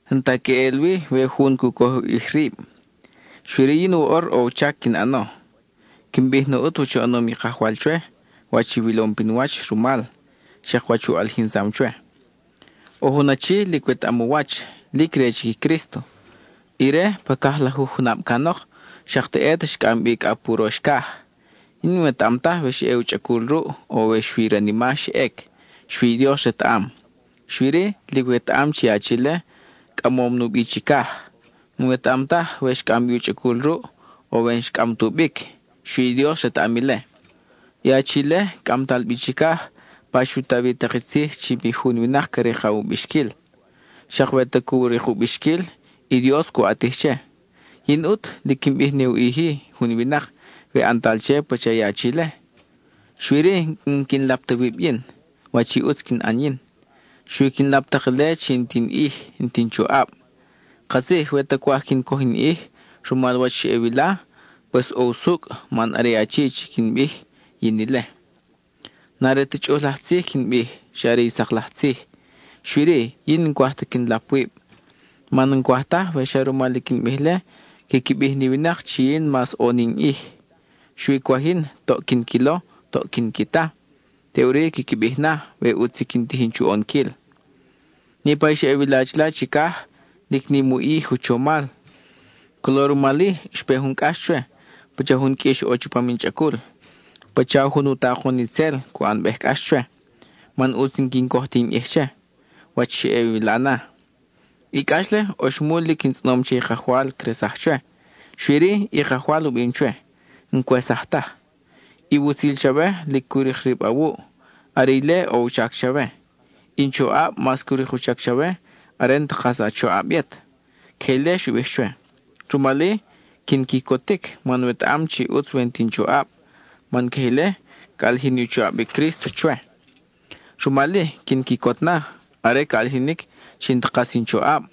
N-ta queʼel wi we jun cu coj u ʼij rib, xui-ri yin woʼor ʼo u chac quin ʼano. Quin bij na ʼut wach u ʼanom i Kajwal chwe, wach i wilom pin wach rumal, xak wach u ʼalijinsam chwe. ʼO jun achi, lic wetaʼam u wach, lic re chic i Crísto. Ire, pa cajlajuj junab canok, xak teʼet xcʼam bi cʼa pa urox caj. Yin n-wetaʼam taj we xa ʼe u chʼacul ruʼ, o we xui i ranima xa ʼec, xui i Dios retaʼam. Xui-ri, lic wetaʼam chi i achi-le, cʼamom nubi chicaj. N-wetaʼam taj we xcʼam bi u chʼacul ruʼ, o we n-xcʼam tubic, xui i Dios retaʼam ile. I achi-le cʼamtal bi chicaj, pa xu ta wi tak i tzij chi mi jun winak ca rikaw u bixquil; xak we ta cu rik u bixquil, i Dios cu ʼatij che. Yin ʼut, lic quin bij ne u ʼij-i jun winak we ʼantal che pacha i achi-le; xui-ri n-quin lap ta wib yin, wach i ʼutz quin ʼan yin. Xui quin lap tak ile chi n-ti in ʼij, n-ti in choʼab. Katzij we ta cwaj quin coj in ʼij (rumal wach xa ʼe wila, pues ʼo usucʼ man are i achi quin bij, yin ile) n-are ta chʼuj laj tzij quin bij, xa are i sak laj tzij. Xui-ri, yin n-cwaj ta quin lap wib, man n-cwaj taj we xa rumal i quin bij-le quiqui bij ni winak chi yin mas ʼo ni in ʼij. Xui cwaj yin toʼ quin quilo, toʼ quin qui ta, teʼuri quiqui bij na, we ʼutz i quin tijin chu ʼonquil. Niʼpa i xa ʼe wila chila chicaj, lic nim u ʼij u chomal. Colo rumal-i xpe jun cʼax chwe, pacha jun qʼuix ʼo chupam in chʼacul; pacha jun u takon itzel, cu ʼanbej cʼax chwe, man ʼutz n-quin coj ti in ʼij che, wach xa ʼe wila na. I cʼax-le, oxmul lic in tzʼonom che i Kajwal cresaj chwe. Xui-ri, i Kajwal u bim chwe: “(N-cwesaj taj.) I wutzil chawe lic cu rik rib awuʼ; are ile ʼo u chac chawe; i in choʼab mas cu rik u chac chawe are n-ta kas a choʼab yet.” Queje ile xu bij chwe. Rumal-i, quin quicotic, man wetaʼam chi ʼutz we n-ti in choʼab, man queje ile ca ʼalijin ni u choʼab i Crísto chwe. Rumal-i, quin quicot na, are ca ʼalijinic chi n-ta kas in choʼab;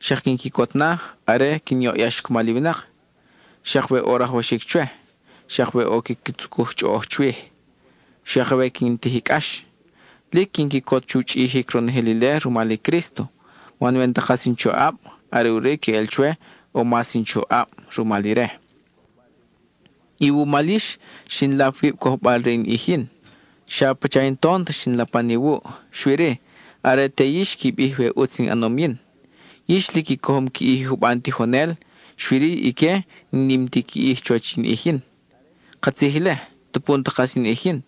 xak quin quicot na, are quin yoʼyax cumal i winak; xak we ʼo rajwaxic chwe; xak we ʼo quiqui tzucuj chʼoʼoj chwij; xak we quin tij i cʼax. Lic quin quicot chu chʼijic ronojel ile rumal i Crísto, man we n-ta kas in choʼab, are ʼuri queʼel chwe ʼo mas in choʼab rumal ire. Iwumal yix, xin lap wib cojbal re in ʼij yin. Xa pacha in tont xin lapan iwuʼ, xui-ri, are te yix qui bij we ʼutz in ʼanom yin. Yix lic i cojom qui ʼij i juban tijonel, xui-ri ique n-nim ti qui ʼij chuwach in ʼij yin. Katzij ile, tupu n-ta kas in ʼij yin.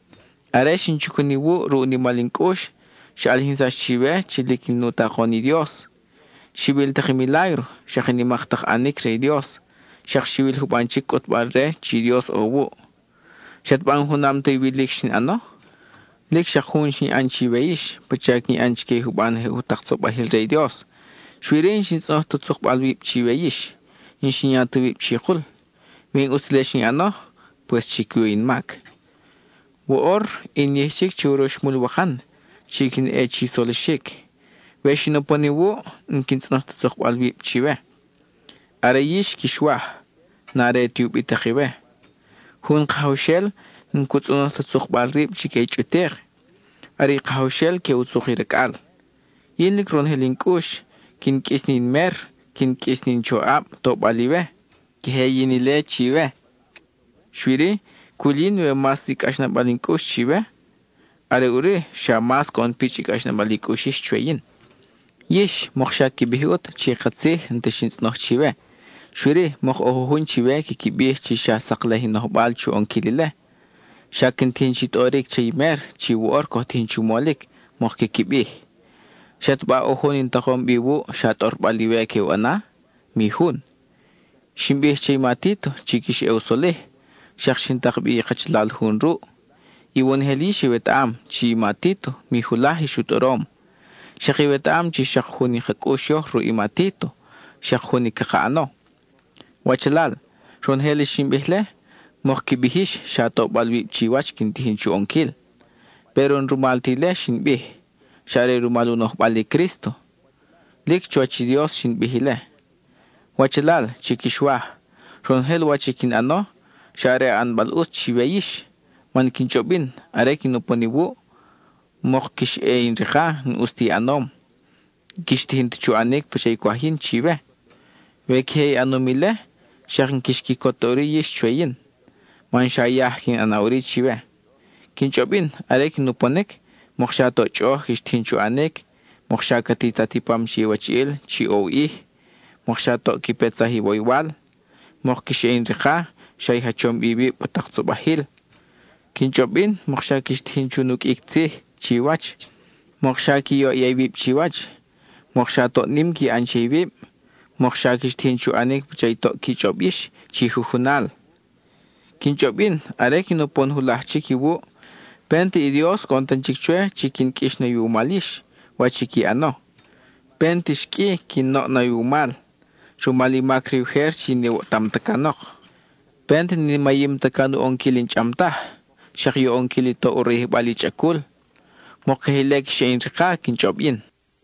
Are xin chacun iwuʼ ruʼ u nimal in cʼux, xa ʼalijinsax chiwe chi lic in u takon i Dios: xiwil tak i milágro, xak i nimak tak ʼanic re i Dios, xak xiwil juban chic cʼutbal-re chi i Dios ʼo wuʼ. ¿Xataba n-junam ta iwilic xin ʼano? Lic xak jun xin ʼan chiwe yix pacha quin ʼan chique i juban je jutak tzobajil re i Dios. Xui-ri, n-xin tzʼonoj ta tzukbal wib chiwe yix, n-xin ya ta wib chikul. We n-ʼus ti ile xin ʼano, ¡pues chi cuyu in mac! Woʼor in yij chic che uroxmul wakan chi quin ʼe chi solixic; we xin upon iwuʼ, n-quin tzʼonoj ta tzukbal wib chiwe. Are yix quix waj; n-are ti ubitak iwe. Jun kajawxel n-cu tzʼonoj ta tzukbal rib chique i chʼutik; are i kajawxel que u tzuk i racʼal. Yin lic ronojel in cʼux quin qʼuis ni in mer, quin qʼuis ni in choʼab, tobal iwe; queje yin ile chiwe. Xui-ri, cwil yin we mas nim i cʼaxnabal in cʼux chiwe, are ʼuri xa mas coʼon pichʼ i cʼaxnabal i cʼux yix chwe yin. Yix, mokxa qui bij ʼut chi katzij n-ta xin tzʼonoj chiwe, xui-ri, mok ʼo jujun chiwe quiqui bij chi xa saklej in nojbal chu ʼonquil ile; xa quin tijin chi tʼoric che i mer chi woʼor coj tijin chu molic, mok quiqui bij. ¿Xataba ʼo jun in takom bi iwuʼ xa tʼorbal iwe que u ʼana? Mi jun. Xin bij che i ma Títo chi quix ʼe u solij, xak xin tak bi i kachalal jun ruʼ. Iwonojel yix iwetaʼam chi i ma Títo mi julaj ix u tʼorom. Xak iwetaʼam chi xak jun i ka cʼux yoj ruʼ i ma Títo, xak jun i caka ʼano. Wachalal, ronojel i xin bij-le, mok qui bij yix xa tobal wib chiwach quin tijin chu ʼonquil. Péro n-rumal ti ile xin bij, xa are rumal u nojbal i Crísto; lic chuwach i Dios xin bij ile. Wachalal chi quix waj, ronojel wach i quin ʼano, xa are ʼanbal ʼutz chiwe yix. Man quin chʼob yin, are quin upon iwuʼ, mok quix ʼe in rika n-ʼus ta i ʼanom, n-quix tijin ta chu ʼanic pacha i cwaj yin chiwe. We queje i ʼanom ile, xak n-quix quicot ta ʼuri yix chwe yin, man xa yaj que in ʼana ʼuri chiwe. Quin chʼob yin, are quin uponic, mokxa toʼ chʼoʼoj quix tijin chu ʼanic; mokxa ca titat i pam che iwachiʼil chi ʼo u ʼij; mokxa toʼ qui petsaj iwoywal; mok quix ʼe in rika xa i jachom bi iwib pa tak tzobajil. Quin chʼob yin mokxa quix tijin chu nuqʼuic tzij chiwach; mokxa qui yoʼya iwib chiwach; mokxa toʼ nim qui ʼan che iwib; mokxa quix tijin chu ʼanic pacha i toʼ qui chʼob yix chi jujunal. Quin chʼob yin, are quin upon julaj chic iwuʼ, pent i Dios coʼon tan chic chwe chi quin qʼuix na iwumal yix, wach i qui ʼano. Pent ix qʼui quin oʼ na iwumal, rumal i mac re ujer chi n-iwoʼtam ta canok. Pent ni mayim ta can u ʼonquil i n-chʼam taj, xak i u ʼonquil i toʼ u rayijbal i chʼacul. Mok queje ile quix ʼe in rika quin chʼob yin.